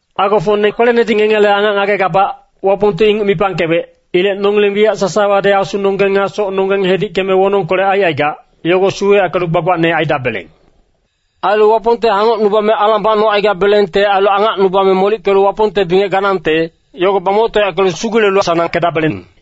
Agofocne kwelenedi ngengele angac ngagegabac, Wapongti inguc mipangkewec. Ilec nongileng wiyac sasawadi asunonggeng nga socnonggeng hedickeme wonongkolec aicaigac, yogo suweyackelu gbagbacne aidabeleng. Ailu Wapongte hangocnubame alang bacnogabelengte ailu angacnubame molickelu Wapongte bingec ganangte, yogo bamoctoyackelu sugulelu sanangkedabeleng.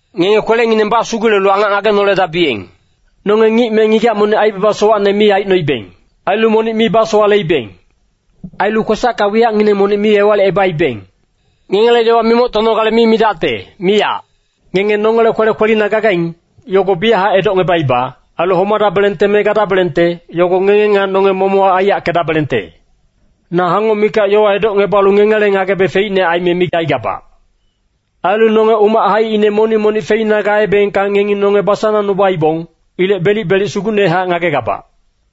Ngenge kwelengineng basugulelu angac ngagenoledabiyeng. Nonge ngic me ngigac monic aibaba sowacne mi aicnoibeng. Ailu monic mi basowaleibeng. Ailu kwesacka wiyacngineng monic mi ewalicebaibeng. Ngengele yowa mimoctonogale mi midacte, miyac. Ngenge nongele kwele kwelina gagaing, yogo biyachac edocngebaiba. Ailu homadabelengte me gadabelengte, yogo ngenge nga nonge momochac aiyackedabelengte. Na hangoc mikac yowa edocngebalu ngengele ngagebe feicne aime micaigabac. Ailu nonge umac haicine monic-monicte feina gaebengka ngengi nonge basanangnubaibong. Ilec belic-belic sugucnehac ngagegabac.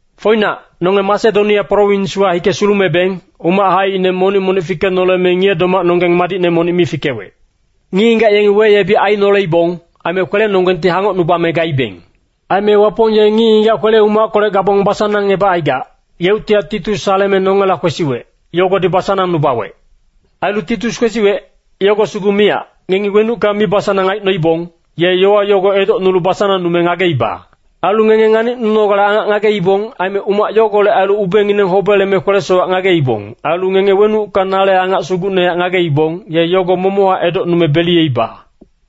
Foinac, nonge Masedonia prowinswa hike sulumebeng, umac haicine monic-monicti fikenoleme ngiye-domacnonggeng madicne monic mi fikewec. Ngic-ngigac yengi weyebic ainoleibong, aime kwelenonggengti hangocnubame gaibeng. Aime Wapong ye ngic-ngigac kwele-umackolec gabong basanangebacaigac, yeuctihac Titus saleme nongela kwesiwec, yogodi basanangnubawec. Ailu Titus kwesiwec, yogo sugu miyac, ngengi wenucka mibasanang aicnoibong, ye yowa yogo edocnulu basanangnume ngageiba. Ailu ngenge nganicnunogale angac ngageibong. Aime umac yogolec ailu ubengineng hobeleme kwele-sowac ngageibong. Ailu ngenge wenucka nale angac sugucnehac ngageibong, ye yogo momochac edocnume beliyeiba.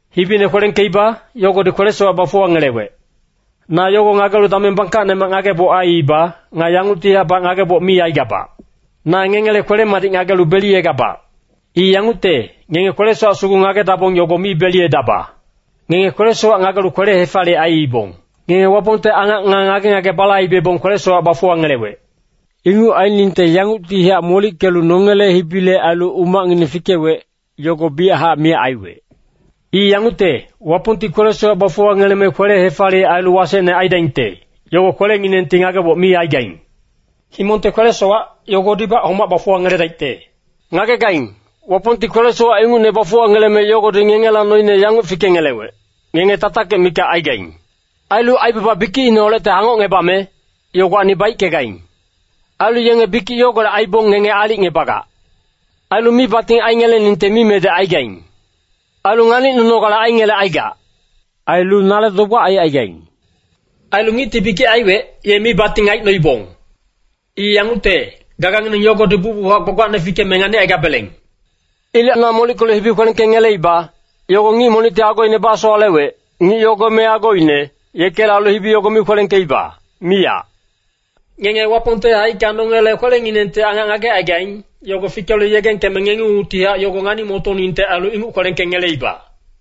Hibine kwelengkeiba, yogodi kwele-sowac bafuwangelewec. Na yogo ngagelu dameng bangkacnemac ngageboc aiiba. Nga yanguctihacbac ngageboc mi aigabac. Na ngengele kwele-madic ngagelu beliyegabac. I yangucte, ngenge kwele-sowac sugu ngagedabong yogo mi beliyedaba. Ngenge kwele-sowac ngagelu kwele-hefaliyec aiibong. Ngenge Wapongte angac nga ngage-ngage balaibebong kwele-sowac bafuwangelewec. Inguc ainingte yanguctihac molickelu nongele hibile ailu umacngineng fikewec, yogo biyachac miyac aiwec. I yangucte, Wapongti kwele-sowac bafuwangeleme kwele-hefaliyec ailu wasecne aidaingte, yogo kwelenginengti ngageboc mi aigaing. Himongte kwele-sowac, yogodibac homac bafuwangeledaicte. Ngagegaing, Wapongti kwele-sowac ingucne bafuwangeleme yogodi ngengela noine yanguc fikengelewec, ngenge tatakic mikac aigaing. Ailu aibaba bikicineholecte hangocngebame, yogowacni baickegaing. Ailu yenge bikic yogolec aibong ngenge aalicngebagac. Ailu mibating aingeleningte mimedec aigaing. Ailu nganicnunogale aingelecaigac. Ailu nale dogbac aicaigaing. Ailu ngicti bikic aiwec, ye mibating aicnoibong. I yangucte, gagangineng yogodi bucbuchac gbagbacne fikeme nganicaigabeleng. Ilec na molickelu hibi kwelengkengeleiba, yogo ngic monicti agoine basowalewec, Ngic yogo me agoine, yekele ailu hibi yogo mi kwelengkeiba, miyac. Ngenge Wapongte haicka nongele kwelenginengti angac ngagecaigaing, yogo fikelu yegengkeme ngengungtihac yogo ngani-motoningte ailu inguc kwelengkengeleiba.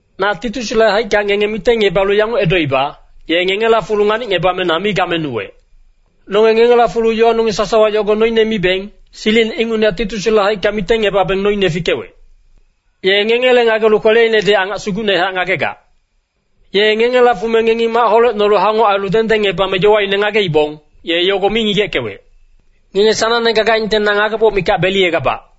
Na Titusle haicka ngenge mitengngebalu yanguc edoiba, ye ngengela fulu nganicngebame na mi gamenuwec. Nonge ngengela fulu yowanonggeng sasawa yogo noine miibeng, silicine ingucnehac Titusle haicka mitengngebabeng noine fikewec. Ye ngengele ngagelu kweleinedi angac sugucnehac ngagegac. Ye ngengela fume ngengi mac holecnolu hangoc ailu dengdengngebame yowaine ngageibong, ye yogo mi ngigeckewec. Ngenge sanangne gagaingte na ngageboc mikac beliyegabac.